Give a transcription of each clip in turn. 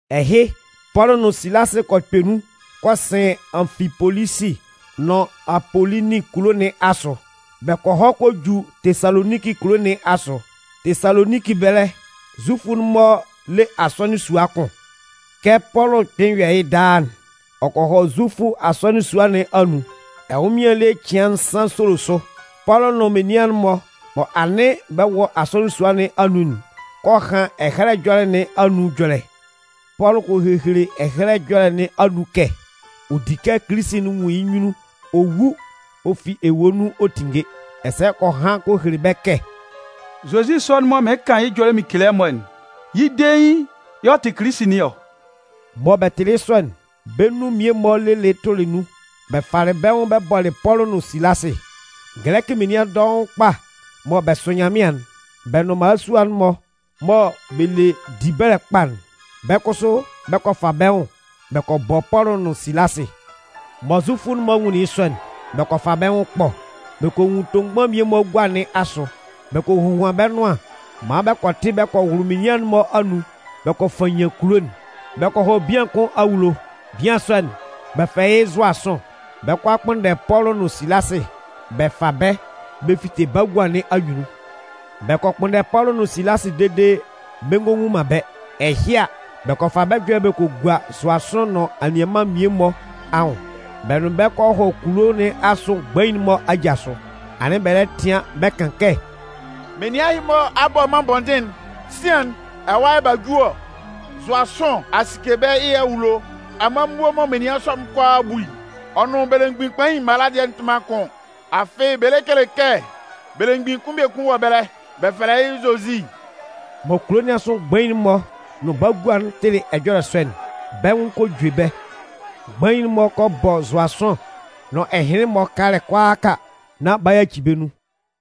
Ɛhɩ, Pɔlʋ nʋn Silasɩ kɔ kpɛ nun kɔ sɩn Anfipolisi nʋn Apolonin kulo nɩn asʋ. Bɛ kɔ hɔ kɔ ju Tesaloninki kulo nɩn asʋ. Tesaloninki ɛbɛlɛ, Zufʋ'n-mɔ le asɔnɩn sua kʋn. Kɛ Pɔlʋ kpɩn yɔ yɩ́ daa'n, ɔ kɔ hɔ Zufʋ asɔnɩn sua nɩn anun. Ɛnwʋnmɩan ele cɩan nsan solo sʋ, Pɔlʋ nʋn menian'n-mɔ mɔ anɩn bɛ wɔ asɔnɩn sua nɩn anun'n kɔ han Ɛhɛlɛ Ɛjɔlɛ nɩn anun ɛjɔlɛ. Pɔlʋ kɔ hehele Ɛhɛlɛ Ɛjɔlɛ nɩn anun kɛ ɔ di kɛ Kilisi'n nwun yɩ́ nyunnun ɔ wu ɔ fi ewue nun ɔ tinnge. Ɛsɛ ɔ kɔ han kɔ hele bɛ́ kɛ: “Zozi sɔ'n mɔ mɩɩn kan yɩ́ ɛjɔlɛ mɩn kele ɛmɔ'n, yɩ́ dein yɛ̂ ɔ tɩ Kilisi nɩn ɔ.” Mɔ bɛ tɩlɩ yɩ́ sɔ'n, bɛ́ nun mmie-mɔ lelɩ tʋlɩ nun bɛ falɩ bɛ́ nwʋn bɛ bɔlɩ Pɔlʋ nʋn Silasɩ. Gɛlɛkɩ menian dɔʋn kpa mɔ bɛ sʋ Nyanmɩan'n, bɛ nʋn mmalasua'n-mɔ mɔ bɛ le dibɛlɛ kpa'n, bɛ́ kʋsʋ bɛ kɔ fa bɛ́ nwʋn bɛ kɔ bɔ Pɔlʋ nʋn Silasɩ. Mɔ Zufʋ'n-mɔ nwunlin yɩ́ sɔ'n, bɛ kɔ fa bɛ́ nwʋn ɛkpɔ. Bɛ kɔ nwun tomgban mmie-mɔ gua nɩn asʋ. Bɛ kɔ hohuan bɛ́ nʋan maan bɛ kɔ tɩ bɛ kɔ wʋlʋ menian'n-mɔ anun bɛ kɔ fannyan kulo'n. Bɛ kɔ hɔ bian kʋn awulo. Bian sɔ'n, bɛ fɛlɛ yɩ́ Zʋasʋn. Bɛ 'kɔ a kpʋnndɛ Pɔlʋ nʋn Silasɩ bɛ fa bɛ́ bɛ fite bagua nɩn anyunnun. Bɛ kɔ kpʋnndɛ Pɔlʋ nʋn Silasɩ dede bɛ ngɔ nwun man bɛ́. Ɛhɩ a, bɛ kɔ fa bɛ́ ɛjɔlɛ bɛ kɔ gua Zʋasʋn nʋn anianman'n mmie-mɔ anwʋn. Bɛ nʋn bɛ́ kɔ hɔ kulo nɩn asʋ mgbain'n-mɔ aja sʋ. Anɩn bɛ lɛ tɩan bɛ kan kɛ: “Menian ɛhɩ-mɔ a bɔ mân bɔndɩn'n. Sian'n, ɛwa yɛ̂ b'a ju ɔ! Zʋasʋn a sike bɛ́ yɩ́ awulo! Amanmuo mɔ menian sɔ'n kʋalaa bu'n, ɔ nʋn belemgbin kpain'n mala dɩɛ'n-mɔ tɩ man kʋn. Afɩ bɛ lɛ kele kɛ belemgbin kʋn biekun wɔ ɛbɛlɛ, bɛ fɛlɛ yɩ́ Zozi.” Mɔ kulo nɩn asʋ mgbain'n-mɔ nʋn bagua'n tɩlɩ ɛjɔlɛ sɔ'n, bɛ́ nwʋn kɔ jue bɛ́. Mgbain'n-mɔ kɔ bɔ Zʋasʋn nʋn ɛhɩnlɩn-mɔ kalɛ kʋalaaka nán b'a yaci bɛ́ nun.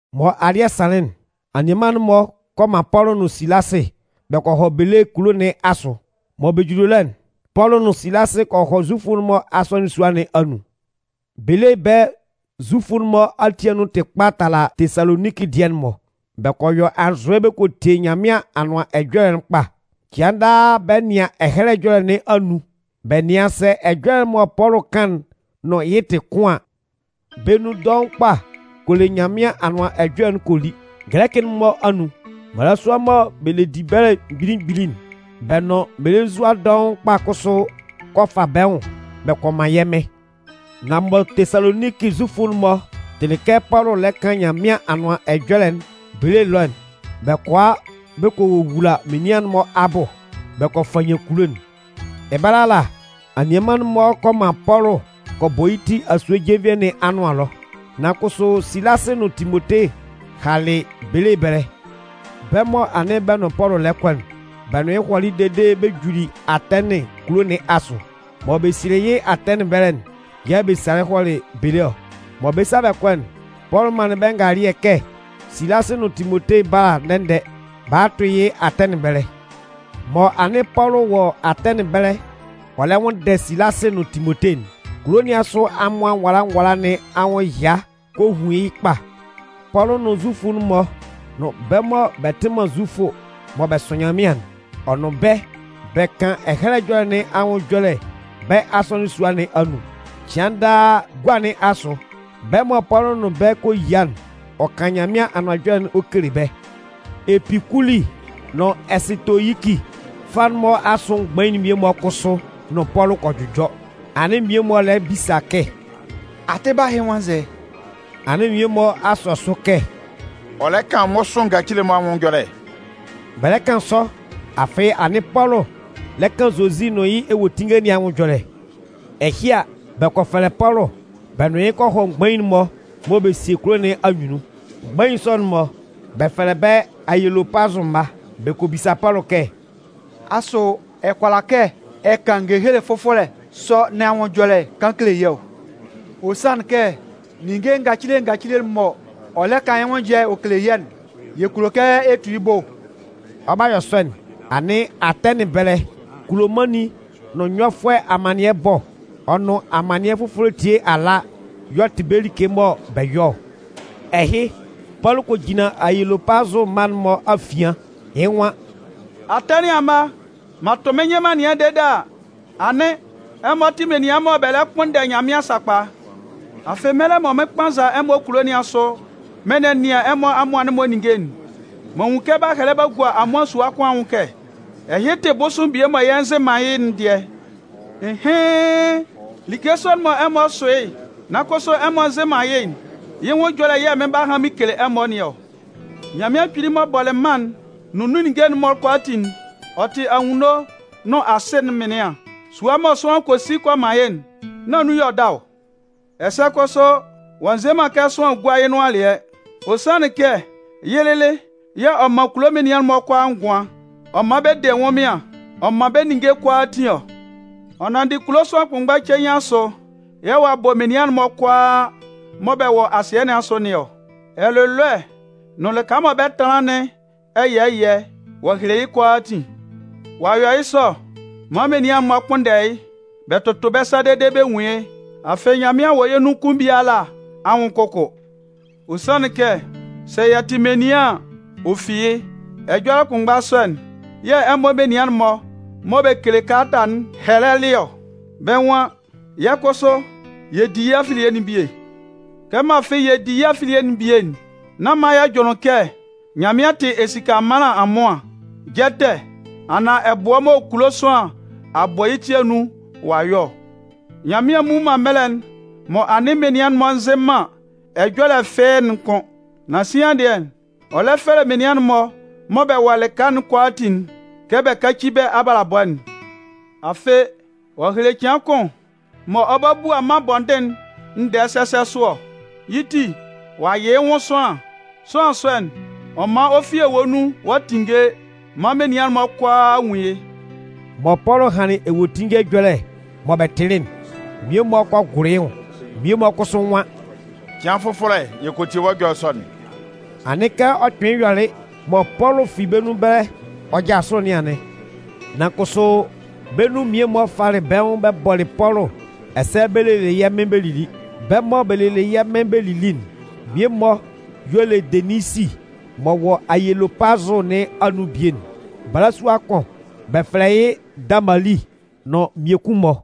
Mɔ alɩ́ɛ sanlɩn'n, anianman'n-mɔ kɔ man Pɔlʋ nʋn Silasɩ bɛ kɔ hɔ Belee kulo nɩn asʋ. Mɔ bɛ juli ɛlɔ'n, Pɔlʋ nʋn Silasɩ kɔ hɔ Zufʋ'n-mɔ asɔnɩn sua nɩn anun. Belee ɛbɛlɛ Zufʋ'n-mɔ ati anun tɩ kpa tala Tesaloninki dɩɛ'n-mɔ. Bɛ kɔ yɔ anzʋɛ bɛ kɔ tie Nyanmɩan Anʋan Ɛjɔlɛ'n kpa. Cɩan daa bɛ nɩan Ɛhɛlɛ Ɛjɔlɛ nɩn anun bɛ nɩan sɛ ɛjɔlɛ'n mɔ Pɔlʋ kan'n nʋn yɩ́ tɩ kʋn an. Bɛ́ nun dɔʋn kpa kɔ le Nyanmɩan Anʋan Ɛjɔlɛ'n kɔ li. Gɛlɛkɩ'n-mɔ anun, mmalasua mɔ bɛ le dibɛlɛ mgbili mgbili'n, bɛ́ nʋn mmelenzua dɔʋn kpa kʋsʋ kɔ fa bɛ́ nwʋn bɛ kɔ man yɛ́ Mɩn. Nan mɔ Tesaloninki Zufʋ'n-mɔ tɩlɩ kɛ Pɔlʋ lɛ kan Nyanmɩan Anʋan Ɛjɔlɛ'n Belee ɛlɔ'n, bɛ kɔ a bɛ kɔ wowula menian'n-mɔ abʋ bɛ kɔ fannyan kulo'n. Ɛbɛlɛ ala, anianman'n-mɔ kɔ man Pɔlʋ kɔ bɔ yɩ́ ti asue jenvie nɩn anʋan ɛlɔ. Nan kʋsʋ Silasɩ nʋn Timote halɩ Belee ɛbɛlɛ. Bɛ́ mɔ anɩn bɛ nʋn Pɔlʋ lɛ kɔ'n, bɛ nʋn yɩ́ hɔlɩ dede bɛ juli Atɛnɩn kulo nɩn asʋ. Mɔ bɛ sielɩ yɩ́ Atɛnɩn ɛbɛlɛ'n yɛ̂ bɛ salɩ hɔlɩ Belee ɔ. Mɔ bɛ 'sa bɛ kɔ'n, Pɔlʋ manlɩn bɛ́ ngalɩɛ kɛ Silasɩ nʋn Timote bála ndɛ-ndɛ ba a tʋ yɩ́ Atɛnɩn ɛbɛlɛ. Mɔ anɩn Pɔlʋ wɔ Atɛnɩn ɛbɛlɛ ɔ lɛ nwʋnndɛ Silasɩ nʋn Timote'n, kulo nɩn asʋ amʋan nwala nwala nɩn anwʋn ɛya kɔ hun yɩ́ kpa. Pɔlʋ nʋn Zufʋ'n-mɔ nʋn bɛ́ mɔ bɛ tɩ man Zufʋ mɔ bɛ sʋ Nyanmɩan'n, ɔ nʋn bɛ́ bɛ kan Ɛhɛlɛ Ɛjɔlɛ nɩn anun ɛjɔlɛ bɛ́ asɔnɩn sua nɩn anun. Cɩan daa gua nɩn asʋ, bɛ́ mɔ Pɔlʋ nʋn bɛ́ kɔ yia'n, ɔ kan Nyanmɩan Anʋan Ɛjɔlɛ'n ɔ kele bɛ́. Epikuli nʋn Ɛsɩtoyiki fâ'n-mɔ asʋ mgbain mmie-mɔ kʋsʋ nʋn Pɔlʋ kɔ jʋjɔ. Anɩn mmie-mɔ lɛ bisa kɛ: “Atɩba ɛhɩ nwan nzɛ?” Anɩn mmie-mɔ a sɔ sʋ kɛ: “Ɔ lɛ kan mmʋsʋɩn ngacile-mɔ anwʋn ɛjɔlɛ”. Bɛ lɛ kan sɔ, afɩ anɩn Pɔlʋ lɛ kan Zozi nʋn yɩ́ ewuetinnge nɩn anwʋn ɛjɔlɛ. Ɛhɩ a, bɛ kɔ fɛlɛ Pɔlʋ bɛ nʋn yɩ́ kɔ hɔ mgbain'n-mɔ mɔ bɛ sie kulo nɩn anyunnun. Mgbain sɔ'n-mɔ, bɛ fɛlɛ bɛ́ “Ayelopazʋ mma”. Bɛ kɔ bisa Pɔlʋ kɛ: “Asʋ, ɛ kʋala kɛ ɛ kan ngehele fʋfɔlɛ sɔ nɩn anwʋn ɛjɔlɛ kaan kele yɛ́ ɔ? Ɔ sanlɩn kɛ, ninnge ngacile ngacile'n mɔ ɔ lɛ kan yɩ́ nwʋn ɛjɔlɛ ɛ kele yɛ́'n, yɛ kulo kɛ ɛ tu yɩ́ bʋ.” Ɔ 'ba yɔ sɔ'n, anɩn Atɛnɩn ɛbɛlɛ, kulomannin nʋn nyɔfʋɛ amannɩɛ ɛbɔ, ɔ nʋn amannɩɛ fʋfɔlɛ etie ala y'ɔ tɩ bɛ́ like mɔ bɛ yɔ ɔ. Ɛhɩ, Pɔlʋ kɔ jinlan Ayelopazʋ mma'n-mɔ afian, yɩ́ nwan: “Atɛnɩn amma, m'an tʋ mɩ́n nyɩn m'an nɛnɩan dede a, anɩn ɛmɔ tɩ menian mɔ bɛ lɛ kpʋnndɛ Nyanmɩan sakpa. Afɩ mɛlɛ mɔ mɩn 'kpannza ɛmɔ kulo nɩn asʋ mɩn nɛnɩan ɛmɔ amʋan'n-mɔ ninnge'n, m'an nwun kɛ b'a hɛlɛ b'a gua amʋan sua kʋn anwʋn kɛ: ‘Ɛhɩ tɩ bʋsʋɩn bie mɔ yɛ nzɩ man yɩ́'n dɩɛ.’ Ɩnhɩn! Like sɔ'n mɔ ɛmɔ sʋ yɩ́ nan kʋsʋ ɛmɔ nzɩ man yɩ́'n, yɩ́ nwʋn ɛjɔlɛ yɛ̂ mɩn 'ba han mɩn kele ɛmɔ nɩn ɔ. “Nyanmɩan Kpili m'ɔ bɔlɩ mân'n nʋn nun ninnge'n-mɔ kʋalaatin'n, ɔ tɩ anwunno nʋn asɩ'n mɩnlɩan. Sua mɔ sʋanlan kɔ si kɔ man yɩ́'n, nán nun y'ɔ da ɔ. Ɛsɛ kʋsʋ ɔ'a nze man kɛ sʋanlan gúa yɩ́ nʋan alɩɛ. Ɔ sanlɩn kɛ yɩ́ lɩlɩ yɛ̂ ɔ man kulo menian'n-mɔ kʋalaa ngʋan, ɔ man bɛ de ɛnwʋnmɩan ɔ man bɛ́ ninnge kʋalaatin ɔ. Ɔ nanndɩ kulo sʋanlan kʋnmgba cein asʋ yɛ̂ ɔ'a bɔ menian'n-mɔ kʋalaa mɔ bɛ wɔ asɩɛ nɩn asʋ nɩn ɔ. Ɛlʋlɔɛ nʋn lɩka mɔ bɛ 'tɛtanlan nɩn ɛyɛɛ ɛyɛɛ, ɔ'a hele yɩ́ kʋalaatin. Ɔ a yɔ yɩ́ sɔ maan menian'n-mɔ kpʋnndɛ yɩ́, bɛ tʋtʋ bɛ́ sa dede bɛ nwun yɩ́. Afɩ Nyanmɩan wɔ yɛ́ nun kʋn biala anwʋn kʋkʋ. Ɔ sanlɩn kɛ ‘sɛ yɛ tɩ menian an, ɔ fi yɩ́.’ Ɛjɔlɛ kʋnmgba sɔ'n yɛ̂ ɛmɔ menian'n-mɔ mɔ bɛ kele kalata'n hɛlɛlɩ ɔ. Bɛ́ nwan: ‘Yɛ́ kʋsʋ, yɛ di yɩ́ afilie'n bie.’ “Kɛmɔ afɩ yɛ di yɩ́ afilie'n bie'n, nán man yɛ jʋnlɩn kɛ Nyanmɩan tɩ esika ɛmanlan amʋan, jɛtɛ anaan ɛbʋɛ mɔ kulo sʋanlan a bɔ yɩ́ ti anun ɔ'a yɔ ɔ. Nyanmɩan mmu man mɛlɛ'n mɔ anɩn menian'n-mɔ nzɩ man ɛjɔlɛ fɩ́ɩ́'n kʋ́n. Nan sian dɩɛ, ɔ lɛ fɛlɛ menian'n-mɔ mɔ bɛ wɔ lɩka kʋalaatin'n kɛ bɛ káci bɛ́ abalabɔ'n. Afɩ, ɔ'a hele cɩan kʋn mɔ ɔ 'ba bua mân bɔndɩn'n ndɛɛ sɛsɛ sʋ ɔ. Yɩ́ ti, ɔ'a yɩ yɩ́ nwʋn sʋanlan. Sʋanlan sɔ'n, ɔ man ɔ fi ewue nun ɔ'a tinnge maan menian'n-mɔ kʋalaa a nwun yɩ́!” Mɔ Pɔlʋ hanlɩn ewuetinnge ɛjɔlɛ mɔ bɛ tɩlɩ'n, mmie-mɔ kɔ gʋlʋ yɩ́ nwʋn, mmie-mɔ kʋsʋ nwan: “Cɩan fʋfɔlɛ yɛ kɔ tie wɔ́ ɛjɔlɛ sɔ'n.” Anɩn kɛ ɔ kpɩnlɩn yɔlɩ mɔ Pɔlʋ fi bɛ́ nun ɛbɛlɛ ɔ jasʋlɩ nɩn anɩn. Nan kʋsʋ, bɛ́ nun mmie-mɔ falɩ bɛ́ nwʋn bɛ bɔlɩ Pɔlʋ ɛsɛ bɛ lelɩ yɛ́ Mɩn bɛ lili. Bɛ́ mɔ bɛ lelɩ yɛ́ Mɩn bɛ lili'n mmie-mɔ y'ɔ le Deninsi m'ɔ wɔ Ayelopazʋ nɩn anun bie'n. Balasua kʋn, bɛ fɛlɛ yɩ́ Damali nʋn mmiekun-mɔ.